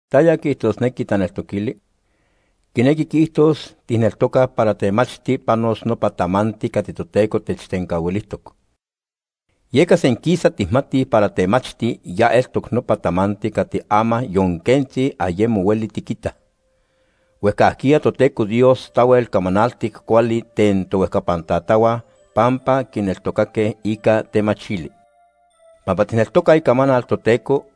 ¿Taya quiijtosnequi taneltoquili? Quinequi quiijtos tijneltocaj para temachti panos nopa tamanti cati Toteco techtencahuilijtoc. Yeca senquisa tijmatij para temachti ya eltoc nopa tamanti cati ama yon quentzi ayemo hueli tiquinitaj. Huejcajquiya Toteco Dios tahuel camanaltic cuali ten tohuejcapan tatahua pampa quineltocaque ica temachili. Pampa tijneltocaj Icamanal Toteco,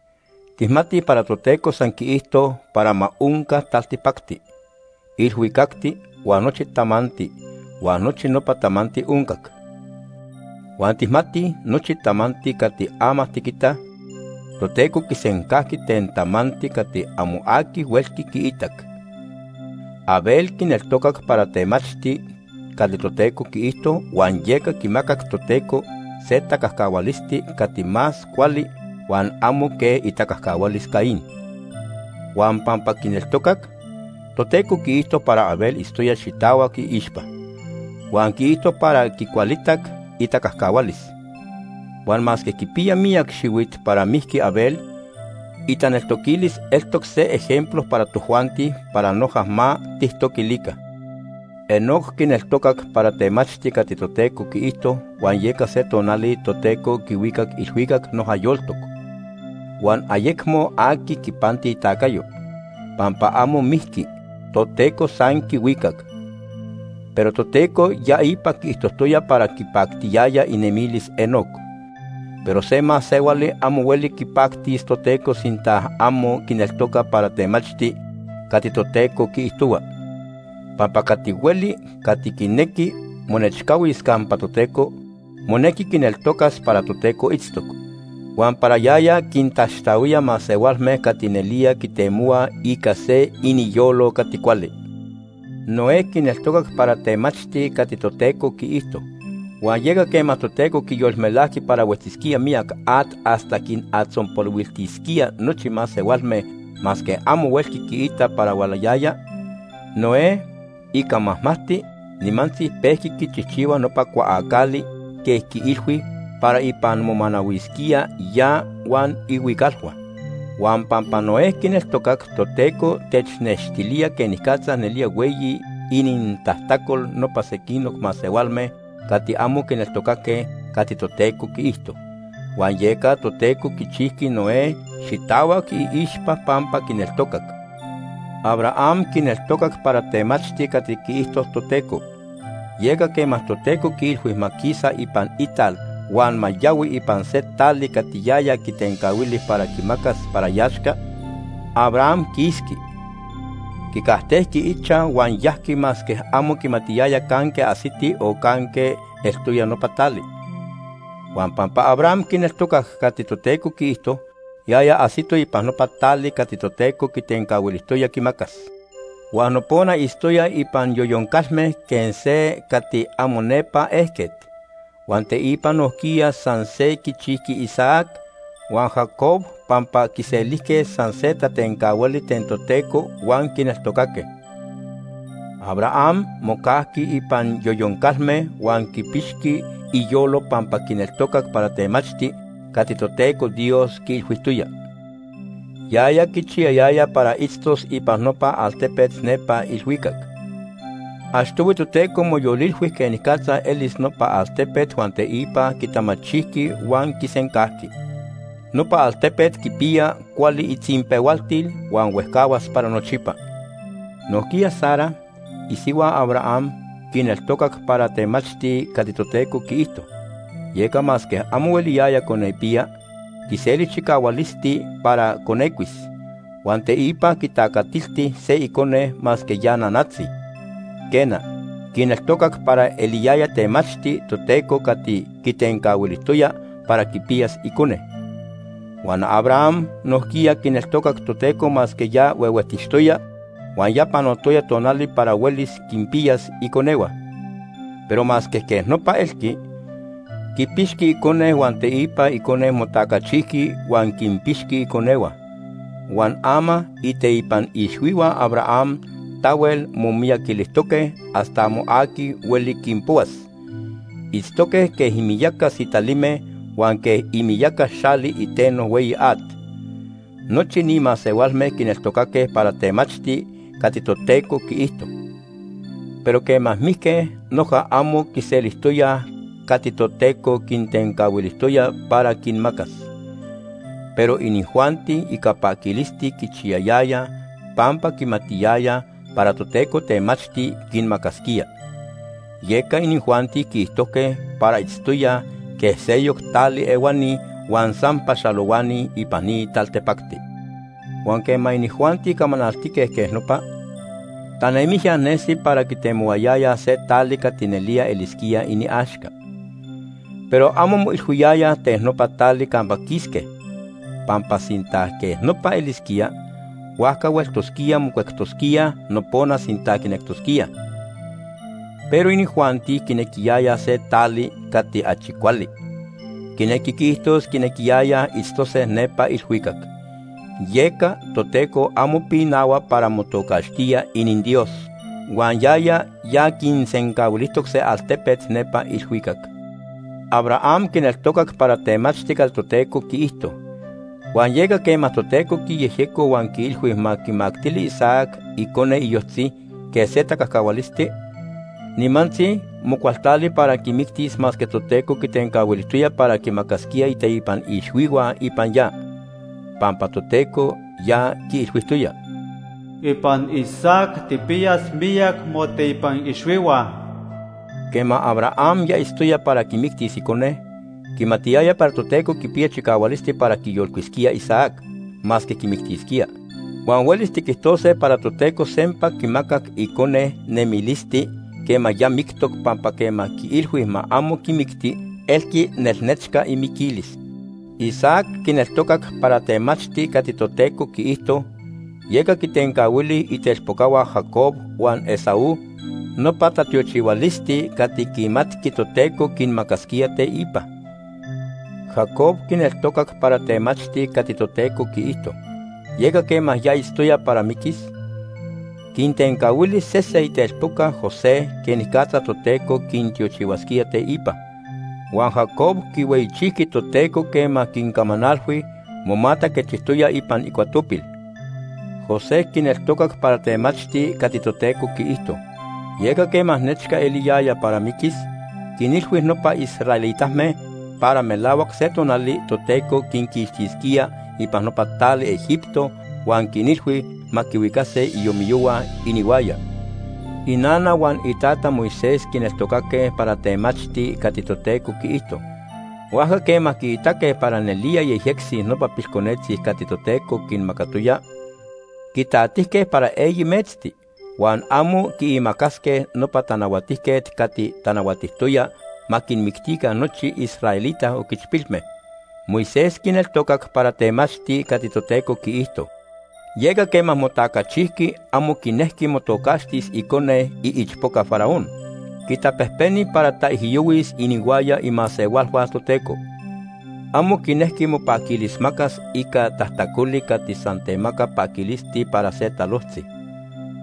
tijmatij para Toteco san quiijto para ma onca taltipacti, ilhuicacti huan nochi tamanti, huan nochi nopa tamanti oncac. Huan tijmatij nochi tamanti cati ama tiquitaj, Toteco quisencajqui ten tamanti cati amo aqui huelqui quiitac. Abel quineltocac para temachti cati Toteco quiijto huan yeca quimacac Toteco se tacajcahualisti cati más cuali huan amo quej itacajcahualis Caín. Huan pampa quineltocac, Toteco quiijto para Abel itztoya xitahuac iixpa, huan quiijto para quicualitac itacajcahualis. Huan masque quipiya miyac xihuit para mijqui Abel, itaneltoquilis eltoc se ejemplo para tojuanti para noja ma tijtoquilica. Enoc quineltocac para temachti cati Toteco quiijto, huan yeca se tonali Toteco quihuicac ilhuicac noja yoltoc. Huan ayecmo aqui quipanti itacayo, pampa amo mijqui, Toteco san quihuicac. Pero Toteco ya ipa quiijtojtoya para quipactiyaya inemilis Enoc. Pero se masehuali amo hueli quipactis Toteco sinta amo quineltoca para temachti cati Toteco quiijtohua. Pampa cati hueli cati quinequi monechcahuis campa Toteco, monequi quineltocas para Toteco itztoc, huan para yaya quintaxtahuía masehualme cati nelía quitemohuaj ica se iniyolo cati cuali. Noé quineltocac para temachti cati Toteco quiijto, huan yeca quema Toteco quiyolmelajqui para huetzisquía miyac at hasta quinatzonpolihuiltisquía nochi masehualme masque amo huelqui quiita para hualayaya, Noé, ica majmajti, nimantzi pejqui quichijchihua nopa cuaacali quej quiilhui para ipan momanahuisquía ya huan ihuicalhua. Huan pampa Noé quineltocac Toteco, technextilía quenicatza nelía hueyi inintajtacol nopa sequinoc masehualme cati amo quineltocaque cati Toteco quiijto. Huan yeca Toteco quichijqui Noé xitahuac iixpa pampa quineltocac. Abraham quineltocac para temachti cati quiijto Toteco. Yeca quema Toteco quiilhui ma quisa ipan ital huan ma yahui ipan se tali cati yaya quitencahuili para quimacas para iaxca, Abraham quisqui. Quicajtejqui ichaj huan yajqui masque amo quimatiyaya canque ajsiti o canque eltoya nopa tali. Huan pampa Abraham quineltocac cati Toteco quiijto, yaya ajsito ipan nopa tali cati Toteco quitencahuilijtoya quimacas. Huan nopona itztoya ipan yoyon calme quej se cati amo nepa ejquet. Huan teipa nojquiya san se quichijqui Isaac huan Jacob pampa quiselijque san se tatencahuali ten Toteco huan quineltocaque. Abraham mocajqui ipan yoyon calme huan quipixqui iyolo pampa quineltocac para temachti cati Toteco Dios quiilhuijtoya. Yaya quichiyayaya para itztos ipan nopa altepet nepa ilhuicac. Achtohui Toteco moyolilhui quenicatza elis nopa altepet huan teipa quitamachijqui huan quisencajqui. Nopa altepet quipiya cuali itzinpehualtil huan huejcahuas para nochipa. Nojquiya Sara, isihua Abraham, quineltocac para temachti cati Toteco quiijto, yeca masque amo hueliyaya conepiya, quiseli chicahualisti para conecuis. Huan teipa quitacatilti se icone masque ya nanatzi. Quena, quineltocac para eliyaya temachti Toteco cati quitencahuilijtoya para quipiyas icone. Huan Abraham nojquiya quineltocac Toteco masque ya huehuejtixtoya huan ya panotoya tonali para huelis quinpiyas iconehua. Pero masque quej nopa elqui, quipixqui icone huan teipa icone motacachijqui huan quinpixqui iconehua. Huan ama iteipan ixhuihua Abraham tahuel momiyaquilijtoque hasta amo aqui hueli quinpohuas. Itztoque quej imiyaca sitalime huan quej imiyaca xali iteno hueyi at. Nochi ni masehualme quineltocaque para temachti cati Toteco quiijto, pero quema mijque noja amo quiselijtoyaj cati Toteco quintencahuilijtoya para quinmacas. Pero inijuanti ica paquilisti quichiyayayaj pampa quimatiyayaj para Toteco temachti quinmacasquía. Yeca inijuanti quiijtojque para itztoyaj quej seyoc tali ehuani huan san paxalohuani ipan ni taltipacti. Huan quema inijuanti camanaltique quej nopa, tanemijya nesi para quitemohuayayaj se tali cati nelía elisquía iniaxca. Pero amo moilhuiyayaj ten nopa tali campa quisque, pampa sinta quej nopa elisquía, huajca hueltosquíaj mocuectosquíaj nopona sinta quinectosquíaj. Pero inijuanti quinequiyayaj se tali cati achi cuali, quinequi quiijtos quinequiyayaj itztose nepa ilhuicac. Yeca Toteco amo pinahua para motocaxtía ininDios, huan yaya ya quinsencahuilijtoc se altepet nepa ilhuicac. Abraham quineltocac para temachti cati Toteco quiijto, huan yeca quema Toteco quiyejyeco huan quiilhui ma quimactili Isaac, icone iyojtzi, quej se tacajcahualisti, nimantzi mocualtali para quimictis masque Toteco quitencahuilijtoya para quimacasquía iteipan ixhuihua ipan ya. Pampa Toteco ya quiilhuijtoya: “Ipan Isaac tijpiyas miyac moteipan ixhuihua.” Quema Abraham ya itztoya para quimictis icone, quimatiyaya para Toteco quipiya chicahualisti para quiyolcuisquía Isaac masque quimictisquía. Huan huelis tiquijtose para Toteco sempa quimacac icone nemilisti quema ya mictoc pampa quema quiilhui ma amo quimicti elqui nelnechca imiquilis. Isaac quineltocac para temachti cati Toteco quiijto, yeca quintencahuili itelpocahua Jacob huan Esaú nopa tatiochihualisti cati quimatqui Toteco quinmacasquía teipa. Jacob quineltocac para temachti cati Toteco quiijto, yeca quema ya itztoya para miquis, quintencahuili sese itelpoca José quenicatza Toteco quintiochihuasquía teipa. Huan Jacob quihueyichijqui Toteco quema quincamanalhui, momataquechijtoya ipan icuatopil. José quineltocac para temachti cati Toteco quiijto. Yeca quema nechca eliyaya para miquis, quinilhui nopa israelitame para melahuac se tonali Toteco quinquixtisquía ipan nopa tali Egipto huan quinilhui ma quihuicase iomiyohua inihuaya. Inana huan itata Moisés quineltocaque para temachti cati Toteco quiijto. Huajca quema quiitaque para nelía yejyectzi nopa pilconetzi cati Toteco quinmacatoya, quitatijque para eyi metzti, huan amo quiimacasque nopa tanahuatijquet cati tanahuatijtoya ma quinmictica nochi israelita oquichpilme. Moisés quineltocac para temachti cati Toteco quiijto. Yeca quema motacachijqui amo quinejqui motocaxtis icone iichpoca Faraón. Quitapejpeni para taijyohuis inihuaya imasehualhua Toteco. Amo quinejqui mopaquilismacas ica tajtacoli cati san temaca paquilisti para se talojtzi.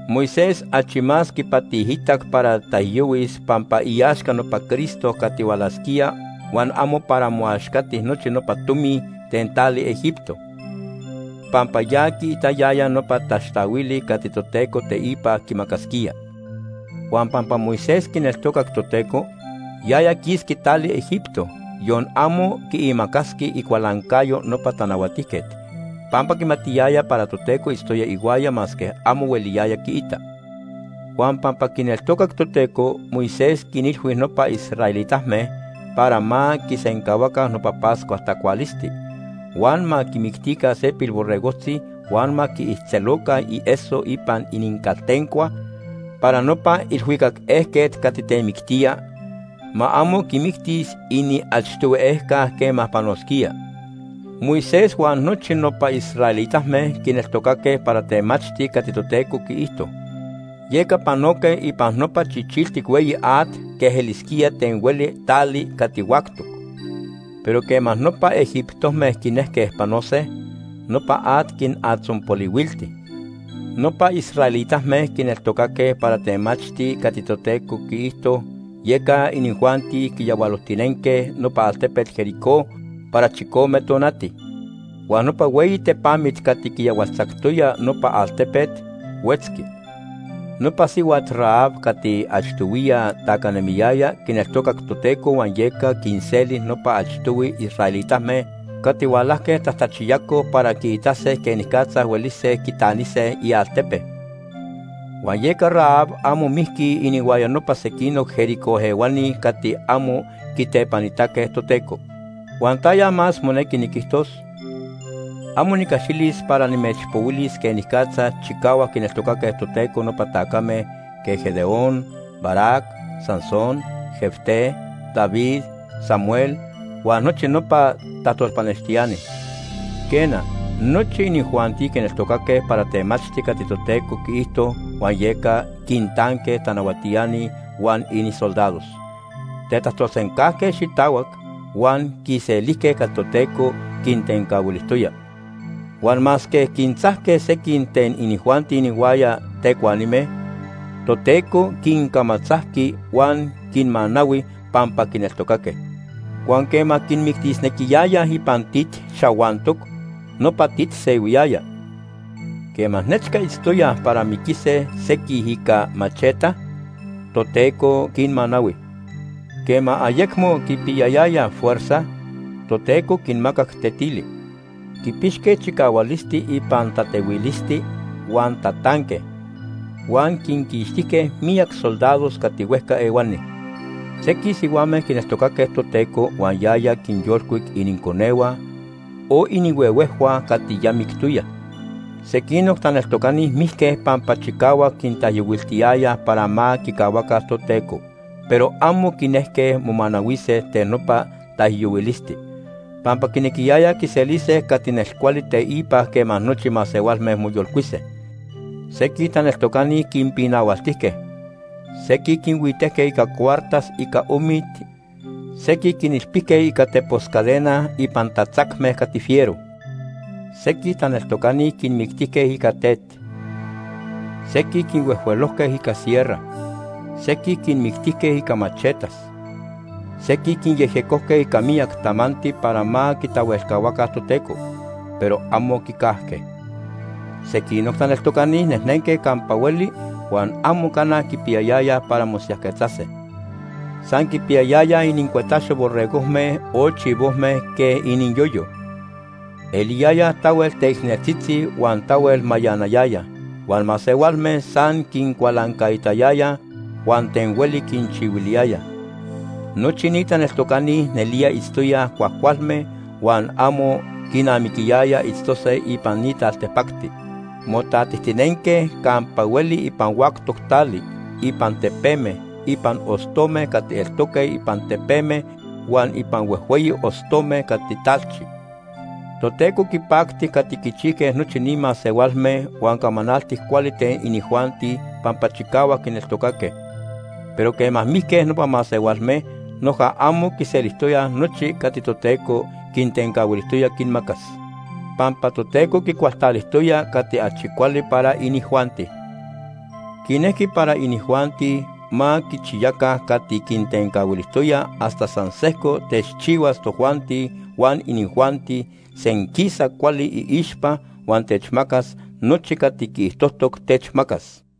Moisés achi más quipatiitac para taijyohuis pampa iaxca nopa Cristo cati hualasquía huan amo para moaxcati nochi nopa tomi ten tali Egipto, pampa ya quiitayaya nopa taxtahuili cati Toteco teipa quimacasquía. Huan pampa Moisés quineltocac Toteco, yaya quisqui tali Egipto, yon amo quiimacasqui icualancayo nopa tanahuatijquet, pampa quimatiyaya para Toteco itztoya ihuaya masque amo hueliyaya quiita. Huan pampa quineltocac Toteco, Moisés quinilhui nopa israelitame para ma quisencahuaca nopa Pascua tacualisti, huan ma quimictica se pilborregojtzi huan ma quiijtzeloca ieso ipan inincaltencua para nopa ilhuicac ejquet cati temictía, ma amo quimictis iniachtohui ejca quema panosquía. Moisés huan nochi nopa israelitame quineltocaque para temachti cati Toteco quiijto, yeca panoque ipan nopa Chichiltic Hueyi At quej elisquía ten hueli tali cati huactoc. Pero quema nopa egiptome quinejque panose, nopa at quinatzonpolihuilti. Nopa israelitame quineltocaque para temachti cati Toteco quiijto, yeca inijuanti quiyahualojtinenque nopa altepet Jericó para chicome tonati. Huan nopa hueyi tepamit cati quiyahualtzactoya nopa altepet, huetzqui. Nopa sihuat Rahab cati achtohuiya tacanemiyaya quineltocac Toteco huan yeca quinseli nopa achtohui israelitame cati hualajque tajtachiyacoj para quiitase quenicatza huelise quitanise ialtepe. Huan yeca Rahab amo mijqui inihuaya nopa sequinoc Jericó ehuani cati amo quitepanitaque Toteco. ¿Huan taya más monequi niquijtos? Amo nicaxilis para nimechpohuilis quenicatza chicahuac quineltocaque Toteco nopa tacame quej Gedeón, Barac, Sansón, Jefté, David, Samuel huan nochi nopa tajtolpanextiani. Quena, nochi inijuanti quineltocaque para temachti cati Toteco quiijto huan yeca quintanque tanahuatiani huan inisoldados, tetajtolsencajque xitahuac, huan quiselijque cati Toteco quintencahuilijtoya. Huan masque quintzajque sequij ten inijuanti inihuaya tecuanime, Toteco quincamatzajqui huan quinmanahui pampa quineltocaque. Huan quema quinmictisnequiyayaj ipan tit xahuantoc, nopa tit sehuiyaya. Quema nechca itztoyaj para miquise sequij ica macheta, Toteco quinmanahui. Quema ayecmo quipiyayayaj fuerza, Toteco quinmacac tetili. Quipixque chicahualisti ipan tatehuilisti huan tatanque, huan quinquixtijque miyac soldados cati huejca ehuani. Sequij sihuame quineltocaque Toteco huan yaya quinyolcuic ininconehua o inihuehuejhua cati ya mictoyaj. Sequinoc taneltocani mijque pampa chicahuac quintaijyohuiltiyayaj para ma quicahuaca Toteco, pero amo quinejque momanahuise ten nopa taijyohuilisti, pampa quinequiyayaj quiselise cati nelcuali teipa quema nochi masehualme moyolcuise. Sequij taneltocani quinpinahualtijque, sequij quinhuitejque ica cuartas ica omit, sequij quinilpijque ica tepos cadena ipan tatzacme cati fiero. Sequij taneltocani quinmictijque ica tet, sequij quinhuejhuelojque ica sierra, sequij quinmictijque ica machetas, sequij quinyejyecojque ica miyac tamanti para ma quitahuelcahuaca Toteco, pero amo quicajque. Sequinoc taneltocani nejnenque campa hueli huan amo cana quipiyayayaj para mosiyajquetzase. San quipiyayayaj inincuetaxo borregojme o chivojme quej iniyoyo. Eliyayaj tahuel teicneltzitzi huan tahuel mayanayayaj, huan masehualme san quincualancaitayayaj huan ten hueli quinchihuiliyayaj. Nochi ni taneltocani nelía itztoyaj cuajcualme huan amo quinamiquiyaya itztose ipan ni taltipacti. Motatijtinenque campa hueli ipan huactoc tali, ipan tepeme, ipan ostome cati eltoque ipan tepeme huan ipan huejhueyi ostome cati talchi. Toteco quipacti cati quichijque nochi ni masehualme huan camanaltic cuali ten inijuanti pampa chicahuac quineltocaque, pero quema mijque nopa masehualme, noja amo quiselijtoyaj nochi cati Toteco quintencahuilijtoya quinmacas. Pampa Toteco quicualtalijtoya cati achi cuali para inijuanti. Quinejqui para inijuanti ma quichiyaca cati quintencahuilijtoya hasta san sejco techchihuas tojuanti huan inijuanti senquisa cuali iixpa huan techmacas nochi cati quiijtojtoc techmacas.